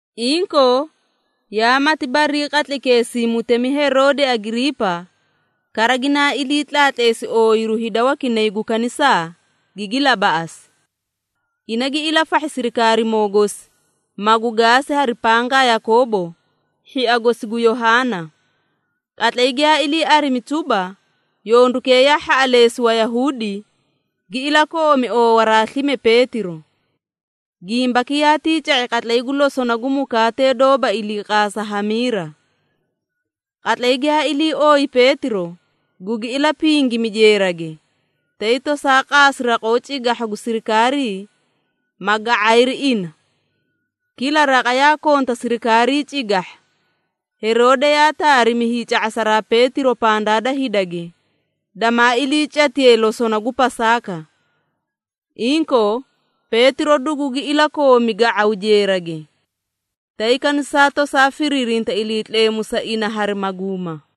Inkoo, yaa mati barii qatlaykeesii Mutemi Heroode Agiriipa, kara ginaa ilii tlaatleesi ooyiru hida wakinay gu kanisaa, gigi labaꞌasi. Ina gi ilafahhi sirikaarimoo gosi, magu gaasi hari pangaa Yakoobo, hhia gosi gu Yohaana. Qatlay giyaa ilii arimi tuba, yondukee yaa hhaꞌaleesi Wayahuudi, gi ilakoomi oowaraa slime Peetiro. (Gimbaki yaatii ca⁄i qatlay gu losona gu mukaatee doóba iliiqaasa hamiira.) Qatlay giyaa ilii ooyi Peetiro, gugi ilapingimi jeerage, tay tosaa qaasi raqoo cigahha gu sirikaarii, ma ga⁄ayri ina. Kila raqa yaa konta sirikaarii cigahha. Heroode yaa taarimi hiica⁄asaraa Peetiro pandaa da hidage, damaa iliicatiye losona gu Pasaaka. Inkoo Peetiro dugugi ilakoomi ga⁄aw jeerage. Tay kanisaa tosaa firiirinta Iliitleemu sa ina hari maguuma.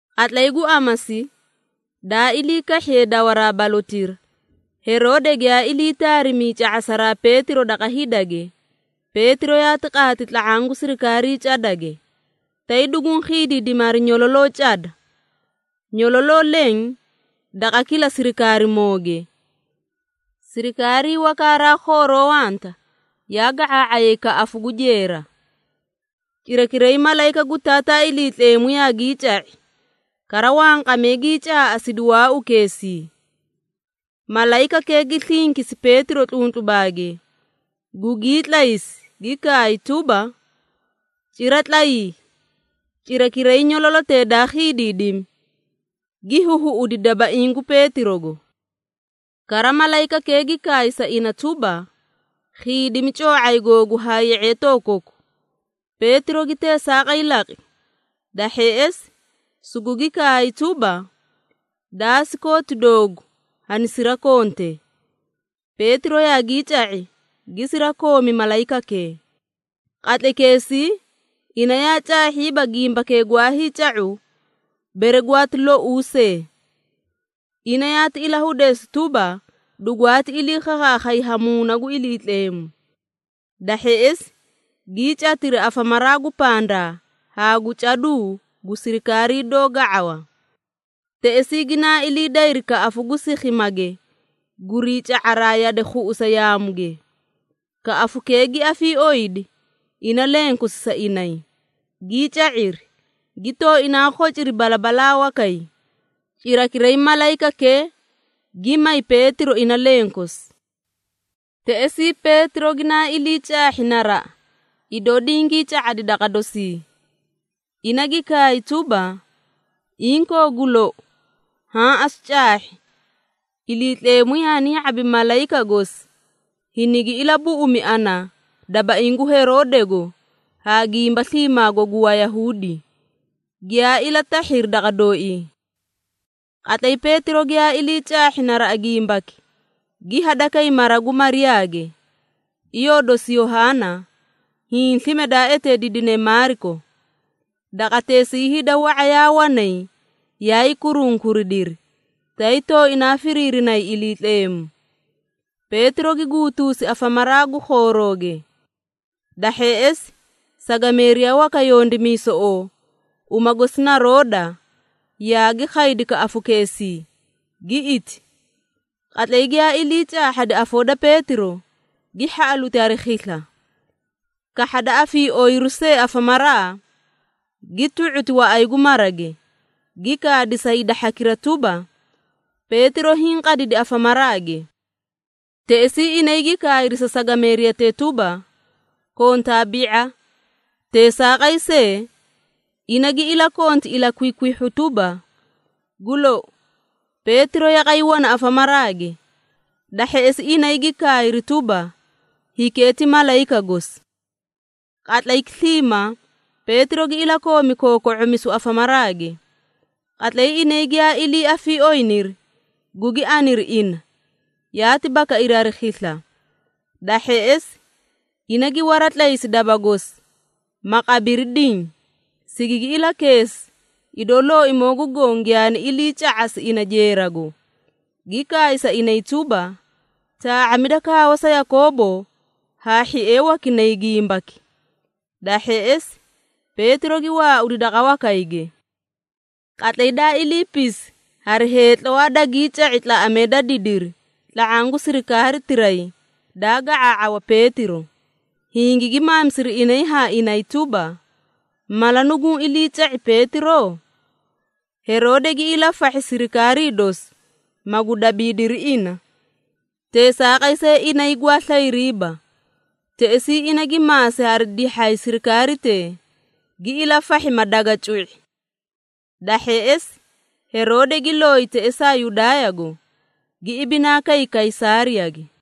Qatlay gu amasi, daa ilii kahhiye dawaraa balotira, Heroode giyaa ilii taarimi hiica⁄asaraa Peetiro daqa hidage, Peetiro yaati qaati tla⁄aã gu sirikaarii cadage, tay duguũ khiidiidimi hari nyololoo cada. Nyololoo leẽ daqa kila sirikaarimooge. Sirikaarii waka haraa khooroo wanta yaa ga⁄aa⁄ayay kaꞌafu gu jeera. Cirakiray malayika gu Taataa Iliitleemu yaagii ca⁄i, kara wanqamee gii caaꞌasidi waaukeesii. Malayikakee gi slinkisi Peetiro tluntlubaage, gugii tlaysi, gi kaay tuba, “Cira tlayii!” Cirakiray nyololotee daa khiidiidimi, gi huhuꞌudi dabaiĩ gu Peetirogo. Kara malayikakee gi kaay sa ina tuba, “Khiidimi coo⁄ay googu haa ye⁄eetoo koku.” Peetiro gi teesaaqay laqi. Da hheꞌesi, sugugi kaay tuba, “Daasi kooti doogu hanisirakonte.” Peetiro yaagii ca⁄i, gi sirakoomi malayikakee. Qatlaykeesii ina yaa caahhiiba gimbakee gwaa hiica⁄u bere gwaati louu see. Ina yaati ilahudeesi tuba, dugwaati iliikhakhaakhay ha Muuna gu Iliitleemu. Da hheꞌesi, gii catiri afamaraa gu pandaa haa gu caduu gu sirikaarii doó ga⁄awa. Teꞌesii ginaa ilii dayri kaꞌafu gu sikhimage gurii ca⁄araa yade khuꞌusa yaamuge. Kaꞌafukee gi afiiooyidi ina lenkosi sa inay, gii ca⁄iri, gi tooinaa khociri balabalaa wakay, cirakiray malayikakee gi may Peetiro ina lenkosi. Teꞌesii Peetiro ginaa ilii caahhi naraꞌa idoo dingii ca⁄adi daqa dosii. Ina gi kaay tuba, “Inkoo gu lou, haã asu caahhi, Iliitleemu yaani ya⁄abi malayika gosi, hinigi ilabuꞌumi ana dabaiĩ gu Heroodego haa gimba sliimaago gu Wayahuudi, giyaa ilatahhiri daqa dooii.” Qatlay Peetiro giyaa ilii caahhi naraꞌa gimbaki, gi hadakay mara gu Mariyaage, iyoo dosi Yohaana, hiĩ slime daa eteediidine Maariko. Daqateesii hida wa⁄a yaa wanay yaay kurunkuridiri, tay tooinaa firiirinay Iliitleemu. Peetiro gi guutuusi afamaraa gu khoorooge. Da hheꞌesi, sagameeriya waka yondimiisoꞌoo, uma gosi na Rooda, yaagi khaydi kaꞌafukeesii, gi iti. Qatlay giyaa ilii caahhadi afoo da Peetiro, gi hhaꞌaluti hari khisla. Kahhada afiiooyiru see afamaraa, gi tu⁄uti waꞌay gu marage, gi kaadi sa hida hhakira tuba, “Peetiro hiĩ qadidi afamaraage!” Teꞌesii inay gi kaayri sa sagameeriyatee tuba, “Kontaa bi⁄a!” Teesaaqay see, ina gi ilakonti ilakwikwihhu tuba, “Gu lou, Peetiro yaqay wana afamaraage.” Da hheꞌesi inay gi kaayri tuba, “Hikee ti malayika gosi.” Qatlayki sliimaa, Peetiro gi ilakoomi kooko⁄omisu afamaraage. Qatlay inay giyaa ilii afiiooyiniri, gugi aniri ina, yaati bakairi hari khisla. Da hheꞌesi, ina gi waratlaysi daba gosi, ma qabiri diĩ, sigigi ilakeesi, idoo Looimoo gu Goõ giyaani iliica⁄asi ina jeerago, gi kaay sa inay tuba, “Taa⁄amida kaawa sa Yakoobo haa hhiee wakinay gimbaki.” Da hheꞌesi, Peetiro gi waaudi daqa wakayge. Qatlay daa iliipisi, hari heetlawaa dagii ca⁄i tlaꞌamee da didiri tla⁄aã gu sirikaaritiray daa ga⁄aa⁄awa Peetiro, hingigi maamisiri inay haa inay tuba, “Mala nuguũ iliica⁄i Peetiro?” Heroode gi ilafahhi sirikaarii dosi, magu dabiidiri ina, teesaaqay see inay gwaa slayriiba. Teꞌesii ina gi maasi hari dihhay sirikaaritee, gi ilafahhi, ma daga cu⁄i. Da hheꞌesi, Heroode gi looyi teꞌesaa Yudaayago, gi ibinaa kay Kaysaariyage.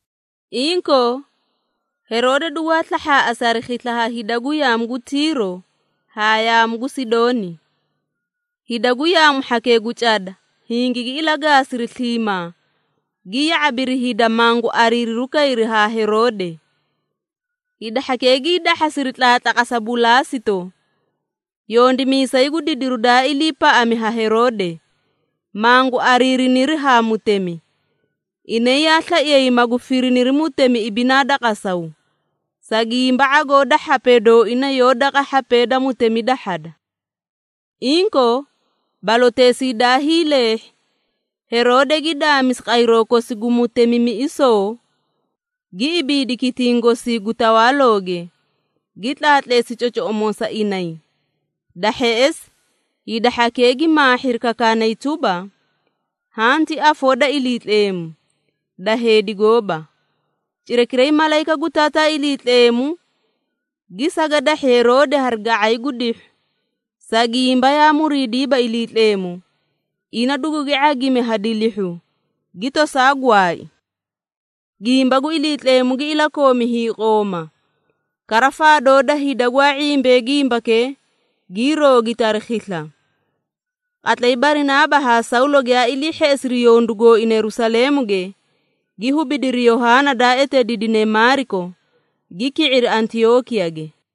Inkoo, Heroode dugwaa slahhaaꞌasi hari khisla ha hida gu yaamu gu Tiiro haa yaamu gu Sidooni. Hida gu yaamu hhakee gu cada hingigi ilagaasiri sliimaa, gi ya⁄abiri hida, mangu ariiriru kayri haa Heroode. Hida hhakee gii dahhasiri tlaatlaqasa Bulaasito, yondimiisay gu didiru daa iliipaꞌami ha Heroode, mangu ariiriniri haa mutemi. Inay yaa slaiyay magu firiniri mutemi ibinaa da qasaw, sa gimba ⁄agoo da hhapee dooina yoó daqa hhapee da mutemi dahhada. Inkoo, baloteesii daa hiileehhi, Heroode gi daamisi qayroo kosi gu mutemimiꞌisoo, gi ibiidi kitiĩ gosii gu tawaalooge, gi tlaatleesi cocoꞌomoo sa inay. Da hheꞌesi, hida hhakee gi maahhiri kakaanay tuba, “Haã ti afoo da iliitleemu, da heedi gooba!” Cirakiray malayika gu Taataa Iliitleemu gi sagadahhi Heroode hari ga⁄ay gu dihhu, sa gimba yaa muriidiiba Iliitleemu. Ina dugugi ⁄agimi ha dilihhu, gi tosaa gwaai. Gimba gu Iliitleemu gi ilakoomi hiiqooma, kara faadoo da hida gwaa ⁄imbee gimbakee, gii roogiti hari khisla. Qatlay Barinaaba haa Sawlo giyaa ilii hheꞌesiri yondu gooina Yerusaleemuge, gi hubidiri Yohaana daa eteediidine Maariko, gi ki⁄iri Antiyookiyage.